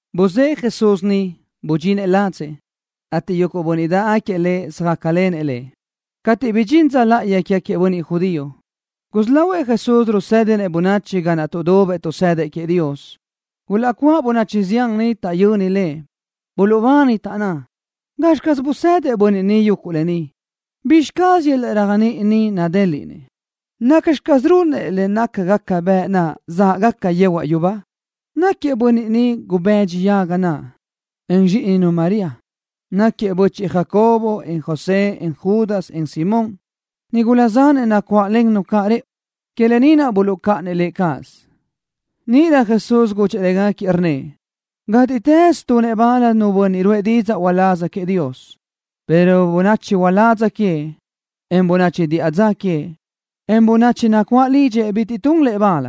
Buzë́ʼë Jesús niʼ, budxinëʼ ladzëʼ, ateʼ yuguʼ bönniʼ dáʼgaquiëʼ Lëʼ söjácalenëʼ Lëʼ. Cateʼ bidxín dza láʼayi quégaquiëʼ bönniʼ judío, gusí lahuëʼ Jesús rusédinëʼ bönachi ga naʼ tuʼdubëʼ tuʼsëdëʼ queëʼ Dios. Gulaʼcuáʼ bönachi zián niʼ taʼyöni Lëʼ. Buluʼbani, taʼnná: —¿Gazxi caz bizë́dëʼ bönniʼ ni yuguʼ lë ni? ¿Bizxi caz yöl-laʼ réajniʼi ni nadéliʼnëʼ? ¿Nacxi caz runëʼ le nácagaca bëʼ naʼ záʼgaca yehuaʼ yubá? Náquiëʼ bönniʼ ni gubëdxi yaga naʼ, en zxíʼininu María. Náquiëʼ bö́chiʼgaquiëʼ Jacobo, en José, en Judas, en Simón. Nigula zanëʼ nacuáʼlennu caʼ rëʼu. Que lë ni naʼ buluʼcáʼanëʼ Lëʼ cáʼasö. Níʼirö Jesús gudxëʼ légaquiëʼ, rnnëʼ: —Gátiʼtës tunëʼ bal nu bönniʼ ruʼë didzaʼ uláz queëʼ Dios, pero bönachi uládz queëʼ, en bönachi diʼa dza queëʼ, en bönachi nacuáʼ lidxëʼ bitiʼ tun lëʼ bal.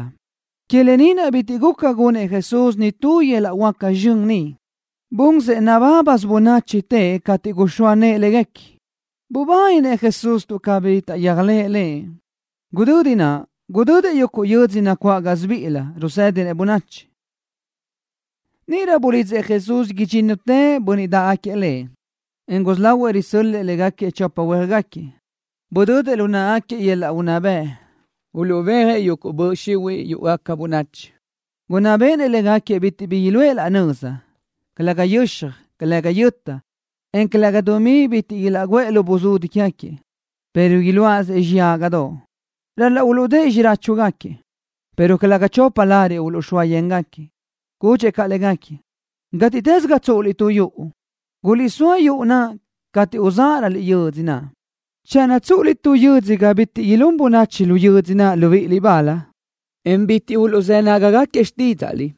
Que lë ni naʼ bitiʼ guca gunëʼ Jesús nitú yöl-laʼ huáca zxön niʼ. Bunsëʼ nabábasö bönachi teʼe cateʼ guxóa nëʼë léguequi. Bubáninëʼ Jesús tuʼ cabí taʼyéajlëʼ Lëʼ. Gudödi naʼ gudödëʼ yuguʼ yö́dzödoʼ nacuáʼ gásibiʼilö, rusë́dinëʼ bönachi niʼ. Níʼirö bulidzëʼ Jesús idxínnutëʼ bönniʼ dáʼgaquiëʼ Lëʼ, en gusí lahuëʼ risö́l-lëʼë légaquiëʼ chopa huéajgaquiëʼ. Budödëʼ lu náʼagaquiëʼ yöl-laʼ unná bëʼ uluʼbéajëʼ yuguʼ böʼ xihuiʼ yúʼugaca bönachi. Gunná béʼenëʼ légaquiëʼ bitiʼ bi iluʼë laʼ nöza, calëga yöxaj, calëga yöta, en calëga dumí bitiʼ ilaʼguʼë lu buzudi quégaquiëʼ, pero iluáʼasëʼ xiyágadoʼ. Ral-laʼ uluʼdë́ʼë xiráchugaquiëʼ, pero calëga chopa lariʼ uluʼxóa yéngaquiëʼ. Gudxëʼ caʼ légaquiëʼ: —Gátiʼtës ga tsúʼuliʼ tu yuʼu, guliʼsóa yuʼu naʼ cateʼ uzáʼaröliʼ yödzö naʼ. Channö tsúʼuliʼ tu yödzö ga bitiʼ ilún bönachi lu yödzö naʼ libíʼiliʼ bal, en bitiʼ uluʼzë́ nágagaquiëʼ xtídzaʼliʼ,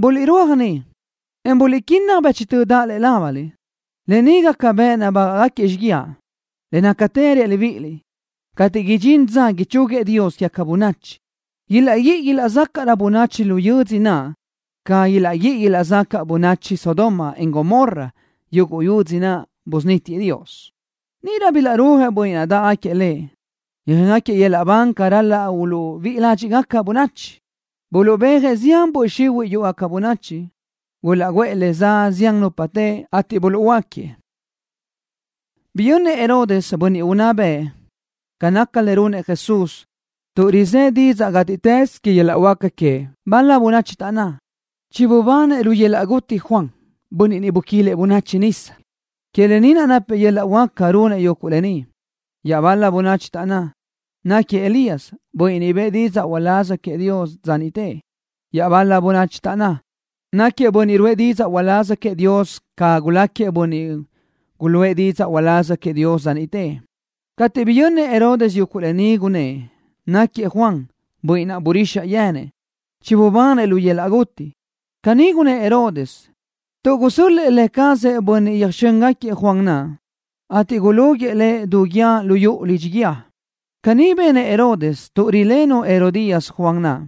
buliʼrúaj niʼ, en buliʼquínnaj bëchtö daʼ lëʼe lábaliʼ. Lë ni gaca bëʼ nabágaʼgaquiëʼ xíguiaʼ. Le nácatë reaʼ libíʼiliʼ, cateʼ idxín dza ichúguiëʼ Dios quégaca bönachi, ilaʼguíʼi ilaʼzácaʼrö bönachi lu yödzö naʼ ca ilaʼguíʼi ilaʼzacaʼ bönachi Sodoma, en Gomorra, yuguʼ yödzö naʼ busunítiëʼ Dios. Níʼirö bilaʼrúajëʼ bönniʼ dáʼgaquiëʼ Lëʼ, yöjéngaquiëʼ libán ca ral-laʼ uluʼbíʼi ládxiʼgaca bönachi. Buluʼbéajëʼ zián böʼ xihuiʼ yúʼugaca bönachi. Gulaʼguʼë le za zián nupa teʼe, ateʼ buluʼhuöáquiëʼ. Biyönnëʼ Herodes, bönniʼ unná bëʼ, ca naca le runëʼ Jesús, tuʼ rizë́ didzaʼ gátiʼtës que yöl-laʼ huáca queëʼ. Bal-la bönachi taʼnná: —Chibubanëʼ Juan, bönniʼ niʼ buquilëʼ bönachi nisa, lu yöl-laʼ guti. Que lë ni naʼ napëʼ yöl-laʼ huáca runëʼ yuguʼ lë ni. Iaʼbal-la bönachi taʼnná: —Naquiëʼ Elías, bönniʼ bëʼë didzaʼ uláz queëʼ Dios dza niʼte. Iaʼbal-la bönachi taʼnná: —Naquiëʼ bönniʼ ruʼë didzaʼ uláz queëʼ Dios ca guláquiëʼ bönniʼ guluʼë didzaʼ uláz queëʼ dza niʼte. Cateʼ biyönnëʼ Herodes yuguʼ lë ni, gunnë́ʼ: —Naquiëʼ Juan, bönniʼ naʼ burixaʼ yenëʼ. Chibubanëʼ lu yöl-laʼ guti. Caní gunnë́ʼ Herodes tuʼ gusö́l-lëʼë lë cazëʼ bönniʼ yöjxö́ngaquiëʼ Juan naʼ, ateʼ gulúguiʼë lëʼ du guíë lu yuʼu lidxi guíë. Caní benëʼ Herodes tuʼ rilenu Herodías Juan naʼ.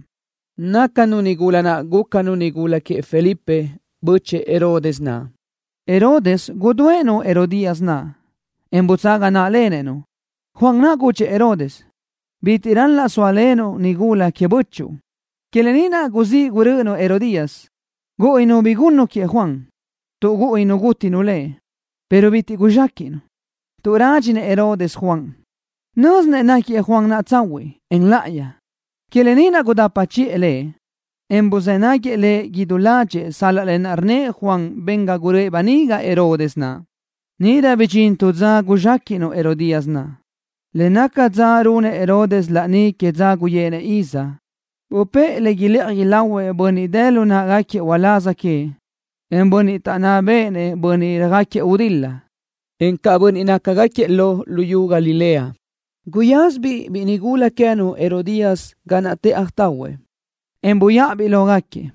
Nácanu nigula naʼ gúcanu nigula queëʼ Felipe, bö́chëʼë Herodes naʼ. Herodes gudúëʼ-nu Herodías naʼ, en butsaga náʼalenëʼ-nu. Juan naʼ gudxëʼ Herodes: —Bitiʼ ral-laʼ sóalenuʼ-nu nigula queëʼ bö́chuʼu. Que lë ni naʼ gusí gurö́ʼönu Herodías. Gúʼuninu bi gunnu queëʼ Juan, tuʼ gúʼuninu gútinu lëʼ, pero bitiʼ bi guzxéquiʼnu tuʼ rádxinëʼ Herodes Juan. Nö́zinëʼ náquiëʼ Juan naʼ tsahuiʼ, en láʼayi. Que lë ni naʼ gudapa chiʼë lëʼ, en buzë́ náguiëʼ lëʼ idú ládxëʼë sal-laʼ lë naʼ rnnëʼ Juan ben ga guröʼë böniga Herodes naʼ. Níʼirö bidxín tu dza guzxéquiʼnu Herodías naʼ, le naca dza runëʼ Herodes laní que dza guyéʼenëʼ iz. Bupë́ʼë le ilëʼaj ilahuëʼ bönniʼ dë lu náʼagaquiëʼ uláz queëʼ, en bönniʼ taʼnná béʼenëʼ bönniʼ röjáquiëʼ gudil-la, encaʼ bönniʼ nácagaquiëʼ lo luyú Galilea. Guyázabiʼ biʼi nigula queë́nu Herodías ga naʼ tëʼaj tahuëʼ, en buyáʼabiʼ lógaquiëʼ.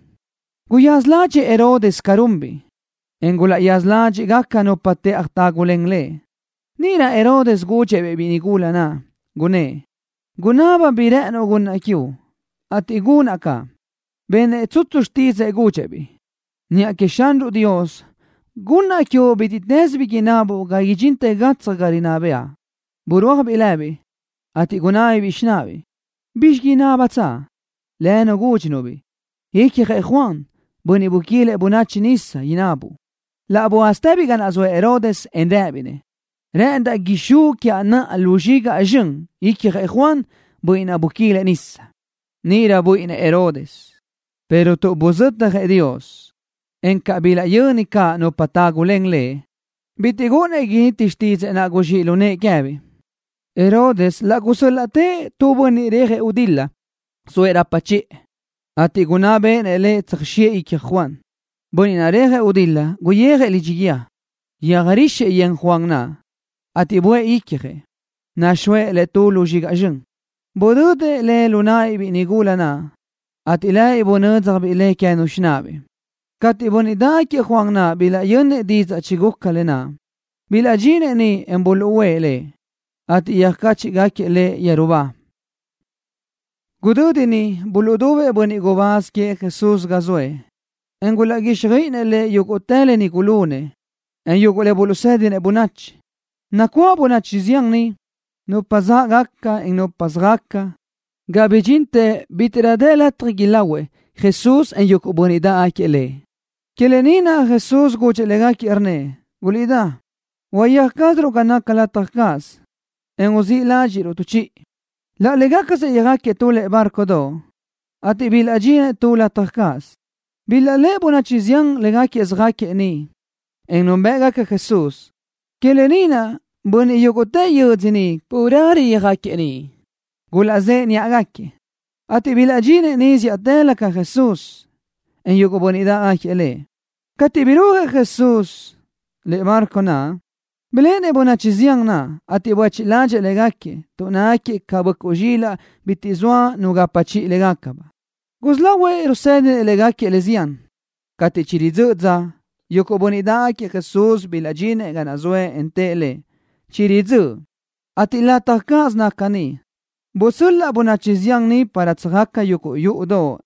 Guyaza ládxëʼë Herodes ca runbiʼ, en gulaʼyaza ládxiʼgaca caʼ nupa tëʼaj tágulen lëʼ. Níʼirö Herodes gudxëʼ-biʼ biʼi nigula naʼ, gunnë́ʼ: —Gunaba bi rë́ʼënuʼ gunnaʼ quiuʼ, ateʼ gunaʼ caʼ. Benëʼ tsutsu xtídzëʼë, gudxëʼ-biʼ: —Niʼa queëʼ Xanruʼ Dios gunnaʼ quiuʼ bítiʼtës bi inabuʼ ga idxintë gatsaj ga rinná bëʼa. Burúajbiʼ lëbiʼ, ateʼ gunábabiʼ xináʼabiʼ: —¿Bizxi inábatsaʼ? Lënu gúdxinu-biʼ: —Icjëʼ Juan, bönniʼ buquilëʼ bönachi nisa, inabuʼ. Laʼ buázatëbiʼ ga naʼ zoëʼ Herodes, en rëbiʼ-nëʼ: —Rëʼëndaʼ ixúʼ quiaʼ naʼa lu zxigaʼ zxön icjëʼ Juan, bönniʼ naʼ buquilëʼ bönachi nisa. Níʼirö buíʼinnëʼ Herodes, pero tuʼ buzötjëʼ Dios, en tuʼ bilaʼyöni caʼ nupa tágulen lëʼ, bitiʼ gúʼunnëʼ initi xtídzëʼë naʼ guzxíʼ lu nëʼë queë́biʼ. Herodes laʼ gusö́l-laʼtëʼ tu bönniʼ rejëʼ gudil-la zoëʼ rapa chiʼë, ateʼ gunná béʼenëʼ lëʼ tsöjxiʼë icjëʼ Juan. Bönniʼ naʼ rejëʼ gudil-la guyijëʼ lidxi guíë, yöjrixëʼ yen Juan naʼ, ateʼ buʼë icjëʼ, nuxóëʼ le tu lu zxigaʼ zxön. Budödëʼ le lu náʼabiʼ biʼi nigula naʼ, ateʼ lëbiʼ bunö́dzjabiʼ le queë́nu xináʼabiʼ. Cateʼ bönniʼ dáʼgaquiëʼ Juan naʼ bilaʼyönnëʼ didzaʼ chiguca lë naʼ, bilaʼdxinëʼ niʼ, en buluʼúʼë lëʼ, ateʼ yöjcáchiʼgaquiëʼ lëʼ yeru ba. Gudödi niʼ buluʼdubëʼ bönniʼ gubáz queëʼ Jesús ga zoëʼ, en gulaʼguíxjöiʼinëʼ Lëʼ yúguʼtë le gulunëʼ, en yuguʼ le buluʼsë́dinëʼ bönachi. Nacuáʼ bönachi zián niʼ, nupa záʼgaca, en nupa söjaca, ga bidxintë bítiʼrö dë lataj ilahuëʼ Jesús, en yuguʼ bönniʼ dáʼgaquiëʼ Lëʼ. Que lë ni naʼ Jesús gudxëʼ légaquiëʼ, rnnëʼ: —Guliʼdá. Uyéaj cázaruʼ ga naca lataj cáʼasö, en uzíʼ ládxiʼruʼ tu chiʼi. Laʼ légacasëʼ yöjáquiëʼ tu lëʼe bárcodoʼ, ateʼ bilaʼdxinëʼ tu lataj cáʼasö. Bilaʼléʼe bönachi zián légaquiëʼ söjáquiëʼ niʼ, en núnbëʼgaca Jesús. Que lë ni naʼ bönniʼ yúguʼtë yödzö niʼ carelö yöjáquiëʼ niʼ. Gulaʼzëʼe níʼagaquiëʼ, ateʼ bilaʼdxinëʼ niʼ zíʼatëlö ca Jesús, en yuguʼ bönniʼ dáʼgaquiëʼ Lëʼ. Cateʼ burúajëʼ Jesús lëʼe bárcodoʼ naʼ, biléʼenëʼ bönachi zián naʼ, ateʼ buéchiʼ ládxëʼë légaquiëʼ tuʼ nácagaquiëʼ ca böʼcuʼ zxílaʼdoʼ bitiʼ zoa nu gapa chiʼi légacabaʼ. Gusí lahuëʼ rusë́dinëʼ légaquiëʼ le zián. Cateʼ chiridzö́ʼ dza naʼ, yuguʼ bönniʼ dáʼgaquiëʼ Jesús bilaʼdxinëʼ ga zoëʼ, en tëʼ Lëʼ: —Chiridzö́ʼ, ateʼ lataj cáʼasö naca ni. Busöl-laʼ bönachi zián ni para tsöjaca yuguʼ yúʼudoʼ,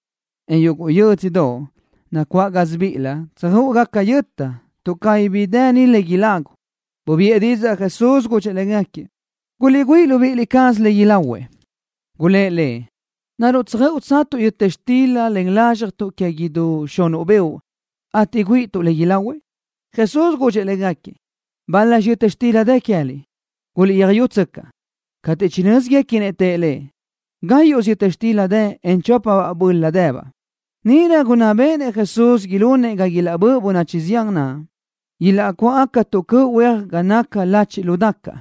en yuguʼ yö́dzödoʼ nacuáʼ gásibiʼilö, tsöjö́ʼugaca yöta, tuʼ cabí bi dë ni le ilagu. Bubiʼë didzaʼ Jesús, gudxëʼ légaquiëʼ: —Guliʼgüíʼ libíʼi cázaliʼ le ilahuëʼ. Gulë́ʼ Lëʼ: —¿Naruʼ tsöjö́ʼutsatuʼ yöta xtila len lázxjatuʼ que idú xunuʼ beoʼ, ateʼ güíʼituʼ le ilahuëʼ? Jesús gudxëʼ légaquiëʼ: —¿Bal-laxi yöta xtila dë queë́liʼ? Guliʼtsöjyútsöcaʼ. Cateʼ chinö́ziguequinëʼ, tëʼ Lëʼ: —Gáyuʼsö yöta xtila dë, en chópasöbaʼ böla dëbaʼ. Níʼirö gunná bëʼë Jesús ilunëʼ ga ilaʼbö́ʼ bönachi zián naʼ, ilaʼcuáʼ tu cöʼ huéajguequi ga naca lachiʼ lu dacaʼ.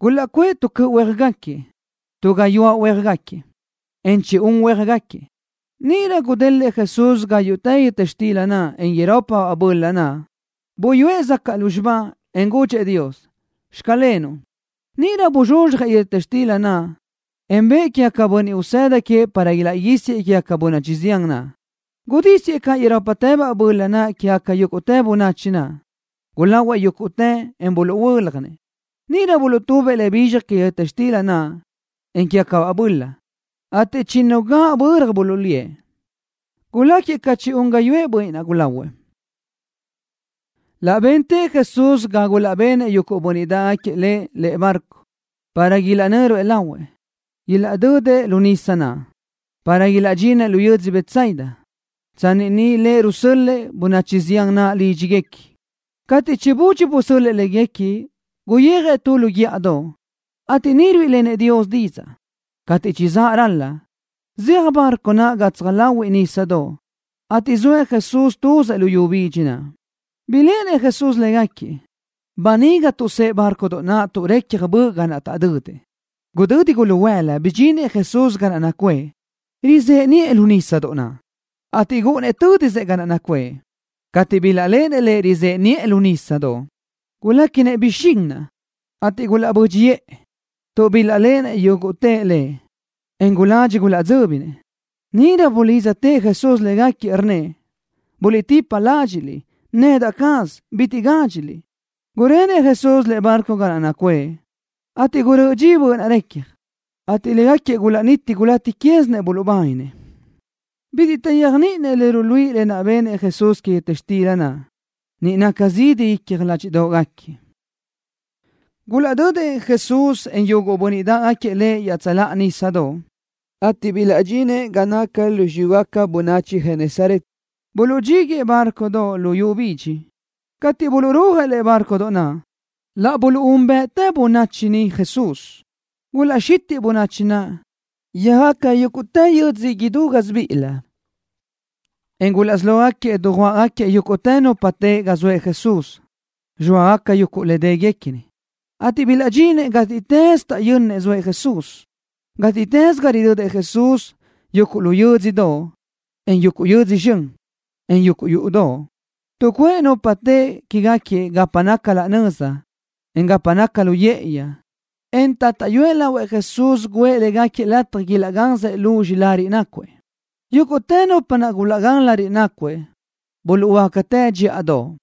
Gulaʼcuʼë tu cöʼ huéajgaquiëʼ, tu gayuáʼ huéajgaquiëʼ, en chi-un huéajgaquiëʼ. Níʼirö gudélëʼë Jesús igáyuʼtë yöta xtila naʼ, en irópabaʼ böla naʼ. Buyúëʼ zacaʼ lúzxiba, en gudxëʼ Dios: “Xclenuʼ.” Níʼirö buzxuzxjëʼ yöta xtila naʼ, en bëʼë quégaquiëʼ bönniʼ usëda queëʼ para ilaʼguísiëʼ quégaca bönachi zián naʼ. Gudísiëʼ caʼ irópatëbaʼ böla naʼ quégaca yúguʼtë bönachi naʼ. Gulahuëʼ yúguʼtëʼ, en buluʼhuö́ljanëʼ. Níʼirö buluʼtubëʼ le bizxaj que yöta xtila naʼ, en quégacabaʼ böla, ateʼ chinnu gaʼböra buluʼlíëʼ. Guláquiëʼ ca chi-un gáyuʼë bönniʼ naʼ gulahuëʼ. Laʼ bentëʼ Jesús ga gulaʼbenëʼ yuguʼ bönniʼ dáʼgaquiëʼ Lëʼ lëʼe bárcodoʼ, para ilaʼnö́ruëʼ lahuëʼ, ilaʼdödëʼ lu nísadoʼ naʼ, para ilaʼdxinëʼ lu yödzö Betsaida, tsanni niʼ Lëʼ rusöl-lëʼ bönachi zián naʼ lídxiguequi. Cateʼ chibudxi busöl-lëʼ légaquiëʼ, guyijëʼ tu lu guíʼadoʼ, ateʼ niʼ ruíʼilenëʼ Dios didzaʼ. Cateʼ chizáʼ ral-la, zeaj bárcodoʼ naʼ gatsaj láhuiʼlö nísadoʼ, ateʼ zoëʼ Jesús tuzëʼ luyú bidxi naʼ. Biléʼenëʼ Jesús légaquiëʼ, böniga tuʼsë́ʼë bárcodoʼ naʼ tuʼ recja böʼ zaʼ ga naʼ taʼdödëʼ. Gudödi guluhuëla bidxinëʼ Jesús ga naʼ nacuʼë, rizëʼe niʼë lu nísadoʼ naʼ, ateʼ gúʼunnëʼ tö́disëʼ ga naʼ nacuʼë. Cateʼ bilaʼléʼenëʼ Lëʼ rizëʼe niʼë lu nísadoʼ, guléquinëʼ bixín naʼ, ateʼ gulaʼbö́dxiʼë tuʼ bilaʼléʼenëʼ yúguʼtëʼ Lëʼ, en guladxi gulaʼdzö́binëʼ. Níʼirö laʼ bulidztëʼ Jesús légaquiëʼ, rnnëʼ: —Buliʼtipa ládxiʼliʼ. Nedaʼ caz. Bitiʼ gádxiliʼ. Gurenëʼ Jesús lëʼe bárcodoʼ ga naʼ nacuʼë, ateʼ gurö́ʼö dxi böʼ naʼ recja, ateʼ légaquiëʼ gulaʼniti gulaʼtíquiʼsinëʼ buluʼbáninëʼ. Bitiʼ taʼyéajniʼininëʼ le ruluíʼi lë naʼ benëʼ Jesús que yöta xtila naʼ. Niʼ naca zidi icja ládxiʼdoʼgaquiëʼ. Gulaʼdödëʼ Jesús, en yuguʼ bönniʼ dáʼgaquiëʼ Lëʼ iaʼtsöláʼa nísadoʼ, ateʼ bilaʼdxinëʼ ga naca lu xiyúgaca bönachi Genesaret. Buluʼdxíguëʼë bárcodoʼ luyú bidxi niʼ. Cateʼ buluʼrúajëʼ lëʼe bárcodoʼ naʼ, laʼ buluʼúnbëʼtë bönachi niʼ Jesús. Gulaʼxitiʼ bönachi naʼ, yöjaca yúguʼtë yö́dzödoʼ idú gásibiʼilö, en gulaʼsí lógaquiëʼ dujuáʼagaquiëʼ yúguʼtë nupa teʼe ga zoëʼ Jesús, zxóagaca yuguʼ le déguequini, ateʼ bilaʼdxinëʼ gátiʼtës taʼyönnëʼ zoëʼ Jesús. Gátiʼtës ga ridödëʼ Jesús, yuguʼ lu yö́dzödoʼ, en yuguʼ yödzö zxön, en yuguʼ yúʼudoʼ, tuʼcuʼë nupa teʼe quégaquiëʼ gapa naca laʼ nöza, en gapa naca lu yë́ʼëyi, en taʼtáʼyuëʼ lahuëʼ Jesús guʼë légaquiëʼ lataj ilaʼgansëʼ luzxi lariʼ nácuëʼ. Yúguʼtë nupa naʼ bilaʼgán lariʼ nácuëʼ buluʼhuöácatë dxíʼadoʼ.